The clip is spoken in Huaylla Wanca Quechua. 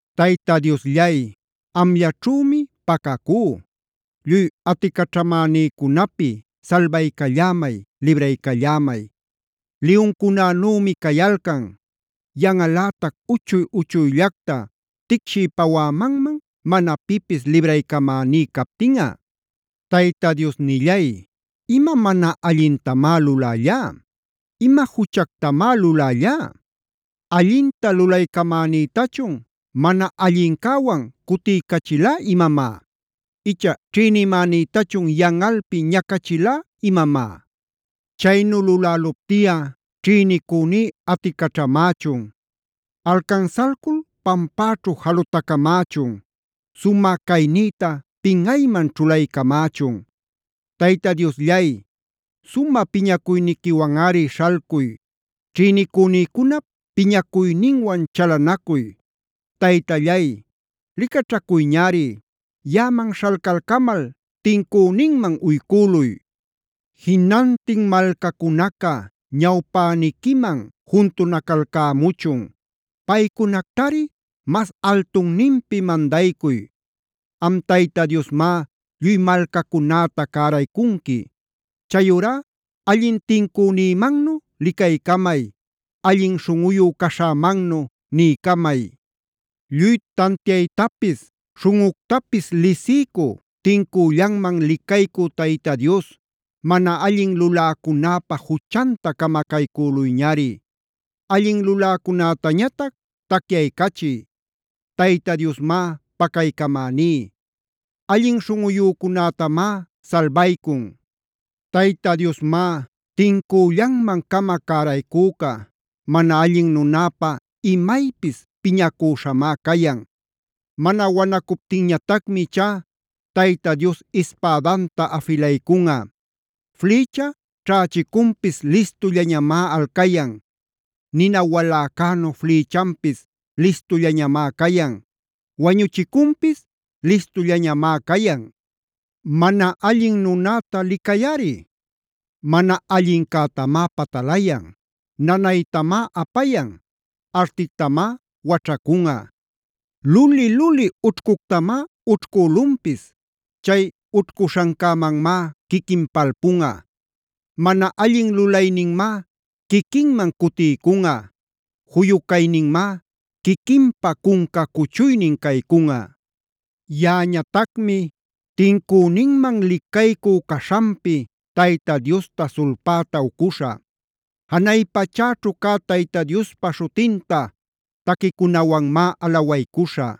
Tayta Diosllay, amllaćhümi pacacú; lluy aticaćhamänïcunapi salbaycallämay, libraycallämay. Liyuncunanümi cayalcan; yanꞌalätac uchuy-uchuyllacta ticshiy-pawämanman mana pipis libraycamäní captinꞌa. Tayta Diosnillay, ¿ima mana allintamá lulällalá? ¿Ima juchactamá lulällalá? ¿Allinta lulaycamänïtachun mana allincäwan cutiycächilá imamá? Icha ¿ćhïnimänïtachun yanꞌalpi ñacachilá imamá? Chaynu luläluptiꞌa ćhïnicüní aticaćhamächun; alcansalcul pampäćhu jalutacamächun. Sumä caynïta pinꞌayman ćhulaycamächun. Tayta Diosllay, sumä piñacuyniquiwanꞌari śhalcuy; ćhïnicünïcunap piñacuyninwan chalanacuy. Taytallay licaćhacuyñari. Yaꞌaman śhalcalcamal tincüninman uycüluy. Jinantin malcacunaca ñawpäniquiman juntunacalcämuchun. Paycunactari mas altunninpi mandaycuy. Am Tayta Diosmá lluy malcacunäta cäraycunqui. Chayurá allin tincünïmannu licaycamay; allin śhunꞌuyu caśhämannu niycamay. Lluy tantiaytapis, śhunꞌuctapis lisiycü, tincüllanman licaycü Tayta Dios,a mana allin luläcunäpa juchanta camacaycüluyñari. Allin luläcunätañatac tacyaycachiy. Tayta Diosmá pacaycamäní. Allin śhunꞌuyücunätamá salbaycun. Tayta Diosmá tincüllanman-cama cäraycüca. Mana allin nunäpa imaypis piñacüśhamá cayan. Mana wanacuptinñatacmi ichá Tayta Dios ispädanta afilaycunꞌa. Flïcha ćhächicunpis listullañamá alcayan. Nina waläcänu flïchanpis listullañamá cayan. Wañuchicunpis listullañamá cayan. Mana allin nunäta licayꞌari: mana allincätamá patalayan, nanaytamá apayan, artictamá waćhacunꞌa. Luli-luli ućhcuctamá ućhcülunpis. Chay ućhcuśhancämanmá quiquin palpunꞌa. Mana allin lulayninmá quiquinman cutiycunꞌa. juyu cayninmá quiquinpa cunca cuchuynin caycunꞌa. Yaꞌañatacmi tincüninman licaycü caśhanpi Tayta Diosta sulpäta ucuśhä. Janay pachäćhu cä Tayta Diospa śhutinta taquicunawanmá alawaycuśhä.